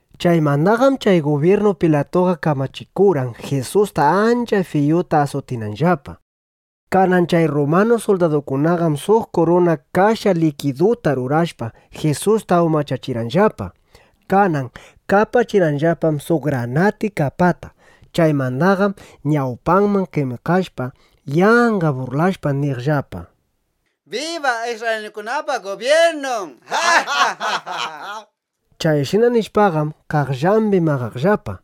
Chaymandaqam chay gubyirnu Pilatuqa kamachikurqan, Jisusta ancha fiyuta asutinanllapa. Kanan chay rrumanu suldadukunaqam suq kuruna kasha likiduta rurashpa, Jisusta umachachirqanllapa. Kanan kapachirqanllapam suq granati kapata. Chaymandaqam ñawpanman qemikashpa, yanqa burlashpa, niqllapa: —¡Biba, isrraylinukunapa gubyirnun! nishpa. Chayshina nishpaqam, qaqllambi maqaqllapa.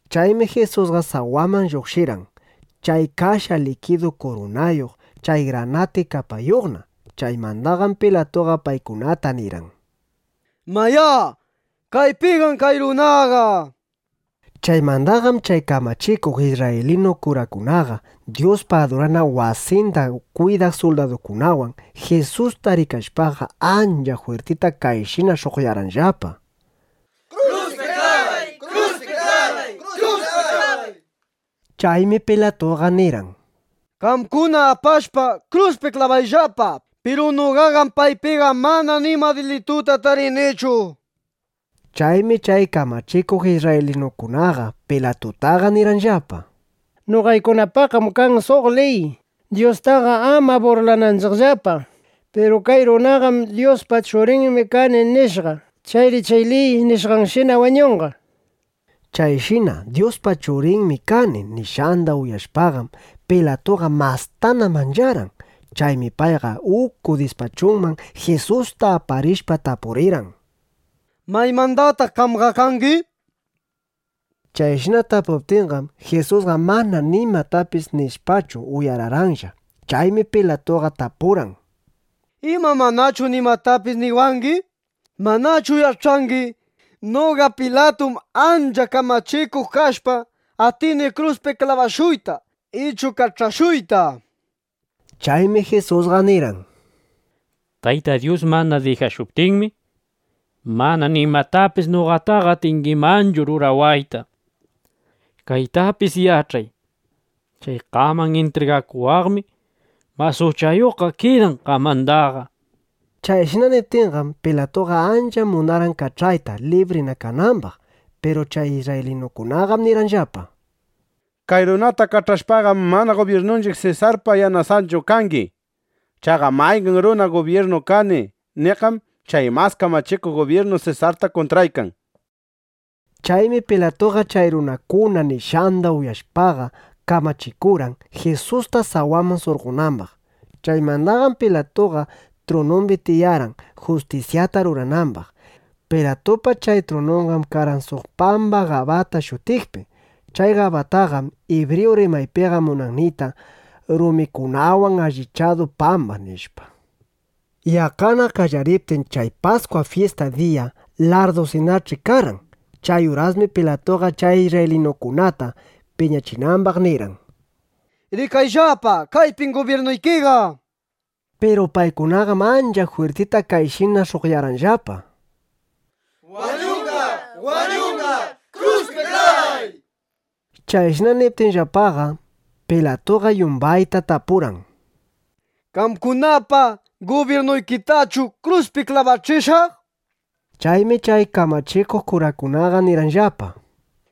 Chaymi Jisusqa sawaman lluqshirqan, chay kasha likidu kurunayuq, chay granati kapayuqna. Chaymandaqam Pilatuqa paykunata nirqan: —¡Mayá, kaypinam kay runaqa! nishpa. Chaymandaqam chay kamachikuq isrraylinu kurakunaqa Dyuspa adurana wasinda kwidaq suldadukunawan Jisusta rikashpaqa, ancha jwirtita kayshina sh'uqyarqanllapa. —¡Kruspi klabay, kruspi klabay! nishpa. Chaymi Pilatuqa nirqan: —Qamkuna apashpa, kruspi klabayllapa. Piru noqaqam paypiqa mana nima dilituta tarinichu, nishpa. Chaymi chay kamachikuq isrraylinukunaqa Pilatutaqa nirqanllapa: —Noqaykunapaqam kan suq liy, Dyustaqa ama burlananchiqllapa. Piru kay runaqam “Dyuspa Churinmi kani”, nishqa. Chayri chay liy nishqanshina wañunqa, nishpa. Chayshina “Dyuspa Churinmi kani”, nishqanda uyashpaqam, Pilatuqa mastana mancharqan. Chaymi payqa uku dispachunman Jisusta aparishpa, tapurirqan: —¿Maymandataq qamqa kangi? nishpa. Chayshina tapuptinqam, Jisusqa mana nimatapis nishpachu, uyararqanlla. Chaymi Pilatuqa tapurqan: —¿Ima manachu nimatapis niwangi? ¿Manachu yach'angi, noqa Pilatum ancha kamachikuq kashpa, atini kruspi klabashuyta, ichu kach'ashuyta, nishpaqa? Chaymi Jisusqa nirqan: —Tayta Dyus mana dijashuptinmi, mana nimatapis noqataqa atingimanchu rurawayta. Kaytapis yach'ay: Chay qaman intrigakuwaqmi mas uchayuqqa kidan qamandaqa, nishpa. Chayshina niptinqam, Pilatuqa ancha munarqan kach'ayta, librina kanambaq. Piru chay isrraylinukunaqam nirqanllapa: —¡Kay runata kach'ashpaqam, mana gubyirnunchiq Sesarpa yanasunchu (yanasanchu) kangi! ¡Chaqa mayqan runa “gubyirnu kani” niqqam chay mas kamachikuq gubyirnu Sesarta kuntraykan! nishpa. Chaymi Pilatuqa chay runakuna nishqanda uyashpaqa kamachikurqan, Jisusta sawaman surqonambaq. Chaymandaqam Pilatuqa trunumbi tiyarqan, justisyata ruranambaq. Pilatupa chay trununqam karqan suq pamba Gabata shutiqpi. Chay Gabataqam ibriyu rimaypiqa munan niyta: “Rumikunawan allichadu pamba”, nishpa. Yaqqana qallariptin chay Paskwa fyista diya, larrdusinach'i karqan. Chay urasmi Pilatuqa chay isrraylinukunata (piñachinambaq) nirqan: —¡Rikayllapa, kaypim gubyirnuykiqa! nishpa. Piru paykunaqam ancha jwirtita kayshina sh'uqyarqanllapa: —¡Wañunqa, wañunqa! ¡Kruspi klabay! nishpa. Chayshina niptinllapaqam, Pilatuqa yumbayta tapurqan: —¿Qamkunapa gubyirnuykitachu kruspi klabachishaq? nishpa. Chaymi chay kamachikuq kurakunaqa nirqanllapa: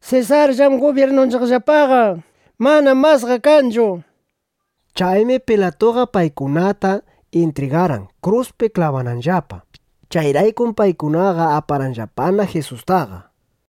—¡Sesarllam gubyirnuyllapaqa! ¡Manam masqa kanchu! nishpa. Chaymi Pilatuqa paykunatana intrigarqan, kruspi klabananllapa. Chayraykum paykunaqa aparqanllapana Jisustaqa.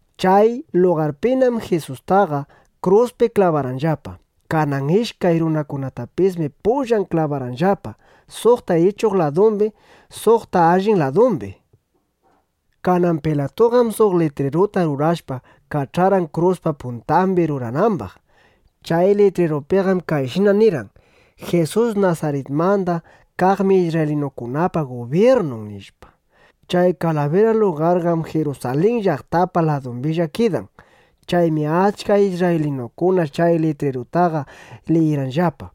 Chay lugarpinam Jisustaqa kruspi klabarqanllapa. Kanan ishkay runakunatapismi pullan klabarqanllapa, suqta ichuq ladumbi, suqta allin ladumbi. Kanan Pilatuqam suq litriruta rurashpa, kach'arqan kruspa puntambi ruranambaq. Chay litrirupiqam kayshina nirqan: “Jisus Nasaritmanda kaqmi isrraylinukunapa Gubyirnun”, nishpa. Chay Kalabira lugarqam Jirusalin llaqtapa ladumbilla kidan. Chaymi achka isrraylinukuna chay litrirutaqa liyirqanllapa.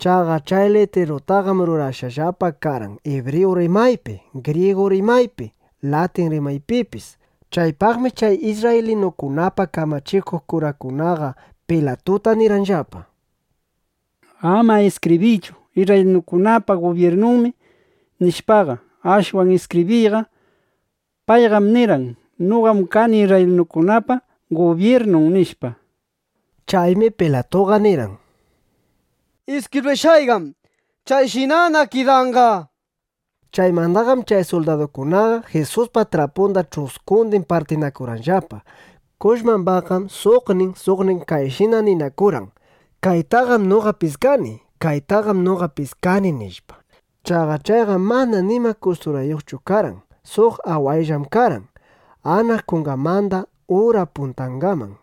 Chaqa chay litrirutaqam rurashqallapa karqan ibriyu rimaypi, grigu rimaypi, latin rimaypipis. Chaypaqmi chay isrraylinukunapa kamachikuq kurangunaqa Pilatuta nirqanllapa: —Ama iskibriychu: “Isrraylinukunapa Gubyirnunmi”, nishpaqa. Ashwan iskibriyqa: “Payqam nirqan: ‘Noqam kani isrraylinukunapa Gubyirnun’”, nishpa. Chaymi Pilatuqa nirqan: —Iskibrishqayqam chayshinana kidanqa, nishpa. Chaymandaqam chay suldadukunaqa Jisuspa trapunda ch'uskundin partinakurqanllapa. Kushmambaqqam suqnin, suqnin kayshina ninakurqan: “Kaytaqam noqa piskani, kaytaqam noqa piskani”, nishpa. Chaqa chayqam mana nima kusturayuqchu karqan. Suq awayllam karqan, anaq kunganmanda ura puntangaman.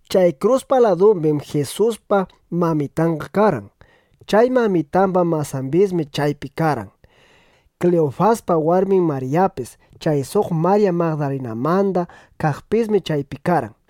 Chay kruspa ladumbim Jisuspa mamitanqa karqan. Chay mamitamba masambismi chaypi karqan. Kliyufaspa warmin Maryapis, chay suq Marya Magdalamanda kaqpismi chaypi karqan.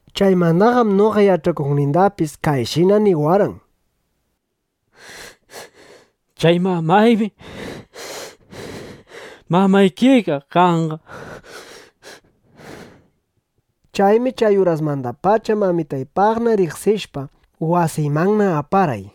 Chaymandaqam noqa yach'akuqnindapis kayshina niwarqan: —Chay mamaymi mamaykiqa kanqa, nishpa. Chaymi chay urasmandapacha mamitaypaqna riqsishpa, wasiymanna aparqay.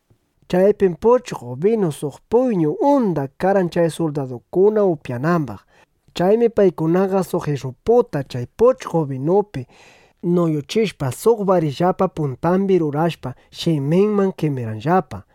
Chaypim puchqo binu suq puyñu unda karqan chay suldadukuna upyanambaq. Chaymi paykunaqa suq ish'uputa chay puchqo binupi nuyuchishpa, suq barillapa puntambi rurashpa, shiminman qemirqanllapa.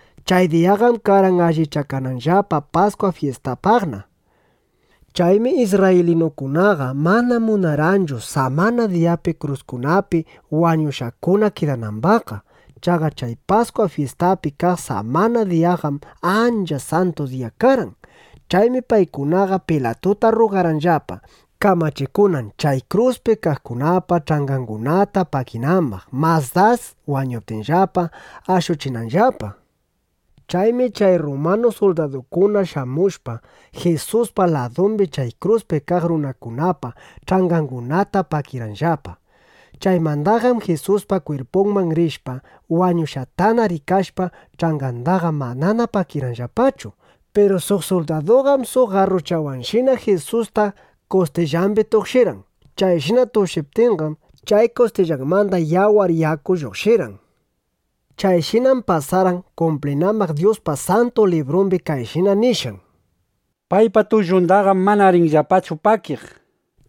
Chay diyaqam karqan allichakananllapa Paskwa fyistapaqna. Chaymi isrraylinukunaqa mana munarqanchu samana diyapi kruskunapi wañushqakuna kidanambaqqa. Chaqa chay Paskwa fyistapi kaq samana diyaqam ancha santu diya karqan. Chaymi paykunaqa Pilatuta rrugarqanllapa, kamachikunan, chay kruspi kaqkunapa ch'angangunata pakinambaq, mas das wañuptinllapa, ashuchinanllapa. Chaymi chay rrumanu suldadukuna shamushpa, Jisuspa ladumbi chay kruspi kaq runakunapa ch'angangunata pakirqanllapa. Chaymandaqam Jisuspa kwirpunman rishpa, wañushqatana rikashpa, ch'angandaqa manana pakirqanllapachu. Piru suq suldaduqam suq garruchawanshina Jisusta kustillambi tukshirqan. Chayshina tukshiptinqam, chay kustillanmanda yawar, yaku lluqshirqan. Chayshinam pasarqan, kumplinambaq Dyuspa Santu Librumbi kayshina nishqan: “Paypa tullundaqam mana rinllapachu pakiq”, nishpa.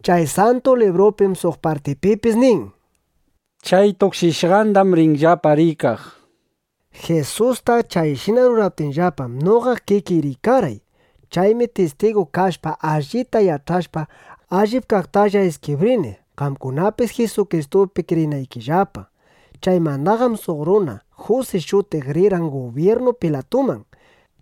Chay Santu Librupim suq partipipis nin: “Chay tukshishqandam rinllapa rikaq”, nishpa. Jisusta chayshina ruraptinllapam, noqa kikiy rikarqay. Chaymi tistigu kashpa, allita yach'ashpa, allip kaqtalla iskibrini, qamkunapis Jisukristupi kriyinaykillapa. Chaymandaqam suq runa Jusi shutiq rirqan gubyirnu Pilatuman.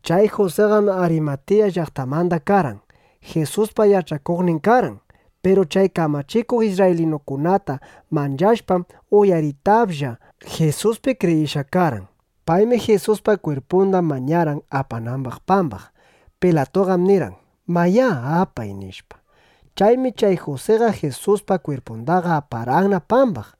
Chay Jusiqam Arimatiya llaqtamanda karqan. Jisuspa yach'akuqnin karqan. Piru chay kamachikuq isrraylinukunata manchashpam, uyaritaplla Jisuspi kriyishqa karqan. Paymi Jisuspa kwirpunda mañarqan, apanambaq pambaq. Pilatuqam nirqan: “Mayá, apay”, nishpa. Chaymi chay Jusiqa Jisuspa kwirpundaqa aparqanna pambaq.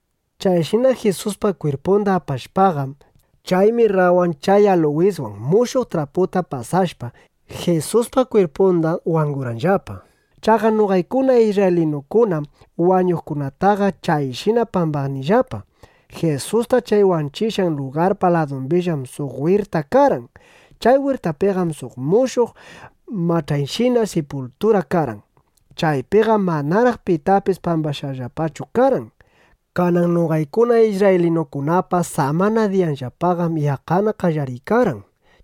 Chayshina Jisuspa kwirpunda apashpaqam, chay mirrawan chay aluwiswan mushuq traputa pasashpa, Jisuspa kwirpunda wangurqanllapa. Chaqa noqaykuna isrraylinukunam wañuqkunataqa chayshina pambanillapa. Jisusta chay wanchishqan lugarpa ladumbillam suq wirta karqan. Chay wirtapiqam suq mushuq mach'ayshina sipultura karqan. Chaypiqam manaraq pitapis pambashqallapachu karqan. Kanan noqaykuna isrraylinukunapa samana diyayllapaqam yaqqana qallariykarqan.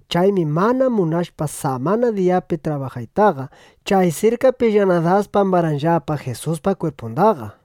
Chaymi mana munashpa samana diyapi trabajaytaqa, chay sirkapillana das pambarqanllapa Jisuspa kwirpundaqa.